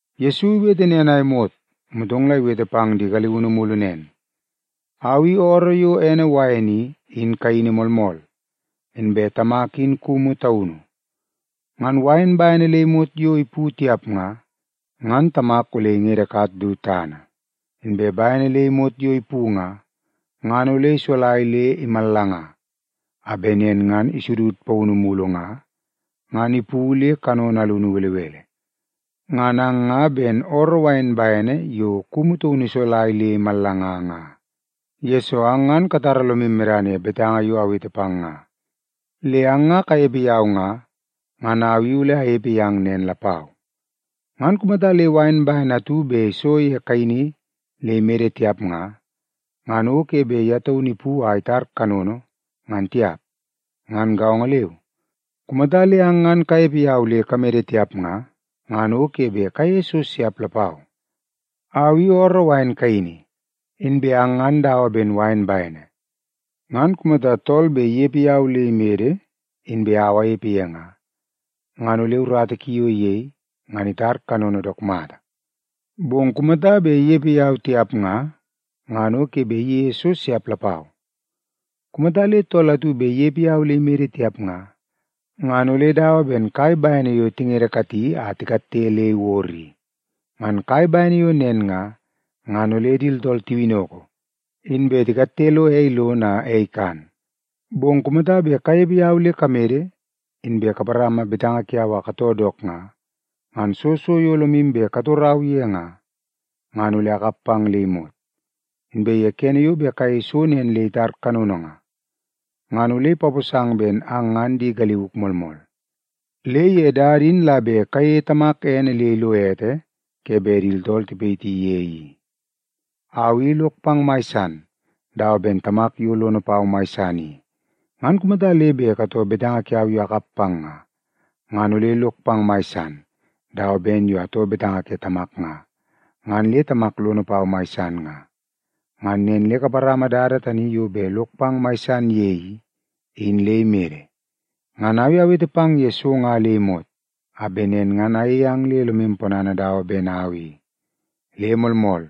Yesu iwete nen a imot, motong la iwete pang di galiunu mulu nen, “Au i ooroo yo ene wain i, in kaini moolmool, inbe Tamak in kumu taunu. Ngan wain bene le imot yo ipu tiap nga, ngan Tamak ole ingedekat du tana. Inbe bene le imot yo ipu nga, ngan ole isolai le imallanga, a bet nen ngan isudud paunu mulu nga, ngan ipu le kanono alunu belebele. Ngan ang nga ben ooroo wain bene yo kumu tamana isolai le imallanga nga, yesoo ang ngan katara lomu medana ye betanga yo awete pang nga. Le ang nga kanepe yau nga, ngan au i ole anepe yang nen lapau. Ngan kumata le wain bene atu bet iso ye wain kaini le imede tiap nga, ngan o ke bet ye taunu ipu a itar kanono, ngan tiap. Ngan gaongo leu, kumata le ang ngan kanepe yau le kamede tiap nga, ngan o ke bet kayeie so siap lapau. “Au i ooroo wain kaini, inbe ang ngan dawa ben wain bene. Ngan kumata tool bet inepe yau le imede inbe au anepe ye nga, ngan ole urata ki yo iyei, ngan itar kanono dook mata. Bong kumata bet inepe yau tiap nga, ngan o ke bet iyeie so siap lapau. Kumata le tool atu bet inepe yau le imede tiap nga, ngan ole dawa ben kai bene yo tingedekati a tikatte le iwod i. Ngan kai bene yo nen nga, ngan ole di tooltool tiwinnoko, inbe tikatte lo ei lono a ei ikan. Bong kumata bet kanepe yau le kamede, inbe kaparama betanga kiau a katoo dook nga, ngan soo so yo lomu bet katorau ye nga, ngan ole akap pang le imot. Inbe ye kene yo bet kayei so nen le itar kanono nga, ngan ole ipaposang ben ang ngan di galiuk moolmool. Le ye dada in la bet kayeie Tamak ene le ilo ete ke bet di tooltool tipayiti ye i. “Au i lok pang mai san, dawa ben Tamak yo lono pau mai san i. Ngan kumata le bet katoo betanga kiau yo akap pang nga, ngan ole lok pang mai san, dawa ben yo atoo betanga ke Tamak nga, ngan le Tamak lono pau mai san nga. Ngan nen le kaparama dada tani yo bet lok pang mai san ye i, in le imede. “Ngan au i awete pang ye so nga le imot, a bet nen ngan ayeie ang le lomu ponana dawa ben au i. Le moolmool,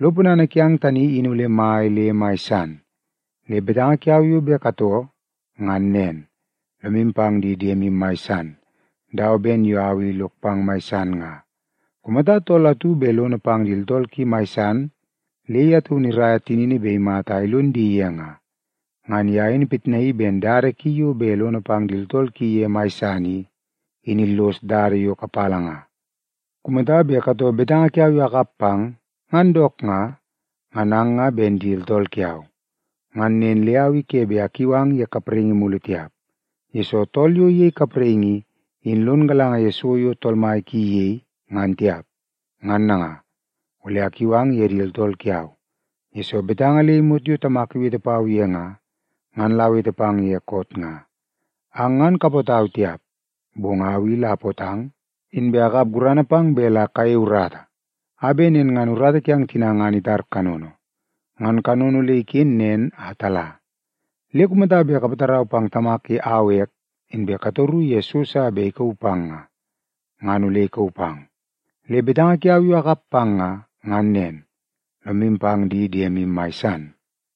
lo ponana kiang tani in ole mai le mai san. Le betanga kiau yo bet katoo ngan nen: Lomu pang di diemu mai san, dawa ben yo au i lok pang mai san nga. Kumata tool atu bet lono pang di tooltool ki mai san, le ye taunu iraia tinini bet imata a ilon di ye nga, ngan ye in ipitnaii ben dada ki yo bet lono pang di tooltool ki ye mai san i, in illos dada yo kapala nga. “Kumata bet katoo betanga kiau yo akap pang ngan dook nga, ngan ang nga ben di tooltool kiau. Ngan nen le au i ke bet akiu ang ye kapraingi mulu tiap, yesoo tool yo iyei kapraingi i, in lon galanga ye so yo tool mai ki iyei, ngan tiap. Ngan nanga, ole akiu ang ye di tooltool kiau, yesoo betanga le imot yo Tamak iwete pau ye nga, ngan la awete pang ye koot nga. Ang ngan kapootau tiap, bong au i la apootang, inbe akap gurana pang bet la kayei urata, a bet nen ngan urata kiang tina ngan itar kanono, ngan kanono ole iken nen a tala. Le kumata bet kapatarau pang Tamak ye au ek, inbe katoru ye so sa bet ikauu pang nga, ngan ole ikauu pang. Le betanga kiau yo akap pang nga, ngan nen: Lomu pang di diemu mai san.”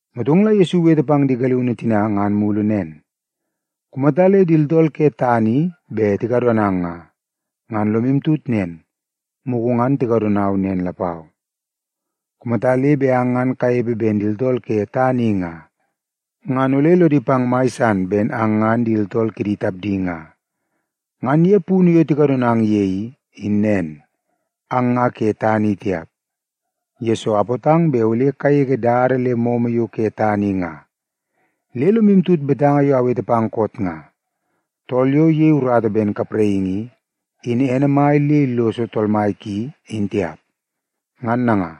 Motong la Yesu iwete pang di galiunu tina ngan mulu nen, “Kumata le di tooltool ke tana i bet tikadonang nga, ngan lomu tut nen, mugu ngan tikadonau nen lapau. Kumata le bet ang ngan kanepe ben di tooltool ke tana i nga, ngan ole lodi pang mai san ben ang ngan di tooltool kidi tapdi nga. Ngan ye punu yo tikadonang ye i, in nen, ang nga ke tana i tiap, yesoo apootang bet ole kagege dada le momo yo ke tana i nga. Le lomu tut betanga yo awete pang koot nga: ‘Tool yo iyei urata ben kapraingi i, in ene mai le illoso tool mai ki, in tiap.’ Ngan nanga,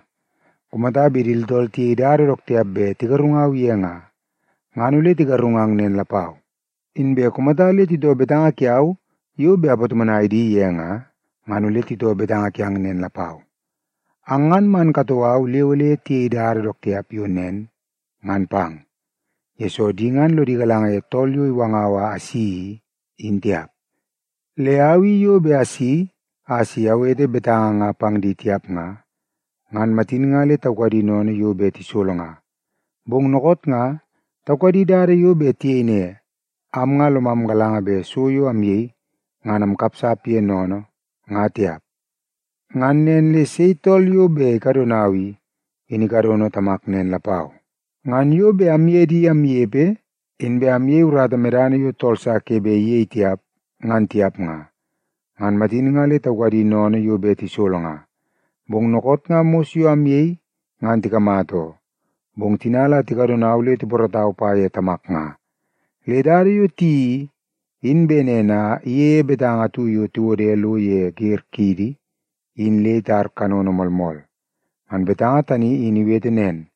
kumata bet di tooltool tiyei dada dook tiap bet tigarungau ye nga, ngan ole tigarungang nen lapau. Inbe kumata le titoo betanga kiau yo bet apatomonai di ye nga, ngan ole titoo betanga kiang nen lapau. Ang ngan man katoo au le ole tiyei dada dook tiap yo nen ngan pang, yesoo di ngan lodi galanga ye Tool yo iwangau a asi i, in tiap. Le au i yo bet asi a si awete betanga nga pang di tiap nga, ngan matin nga le taukadi sennene yo bet tisolo nga. Bong dookoot nga, taukadi dada yo bet tiyei ne, ‘Am nga lomam galanga bet so yo amyei, ngan amkapsap ye sennene, nga tiap.’ Ngan nen le sei tool yo bet ikadonau i, in ikadono Tamak nen lapau. Ngan yo bet amye di amnepe inbe ayei urata medana yo tool sa ke bet iyei tiap, ngan tiap nga, ngan matin nga le taukadi sennene yo bet tisolo nga. Bong dookoot nga mos yo ayei ngan tikamata oo, bong tina la tikadonau le tipoorootau pa ye Tamak nga. Le dada yo tiyeii i, in bet nen a iyeie betanga atu yo tiwode lo ye wer kidi in le itar kanono moolmool. Ngan betanga tani in iwete nen,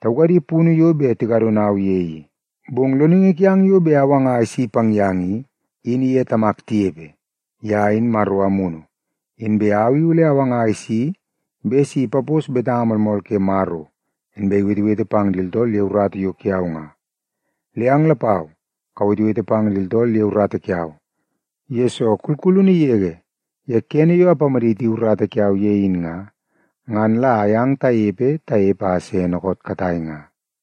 ‘Taukadi punu yo bet tikadonau ye i.’ “Bong Loningi kiang yo bet awanga a isi pang yang i, in iye Tamak tinepe. Ye in Maro Amunu, inbe au i ole awanga a isi bet si ipapos betanga moolmool ke Maro, inbe iwetewete pang di tooltool ye urata yo kiau nga. Le ang lapau kawetewete pang di tooltool ye urata kiau, yesoo kulkulunu yege ye kene yo apamaditi urata kiau ye in nga, ngan la ayang tanepe tanepe le se dookoot katai nga.”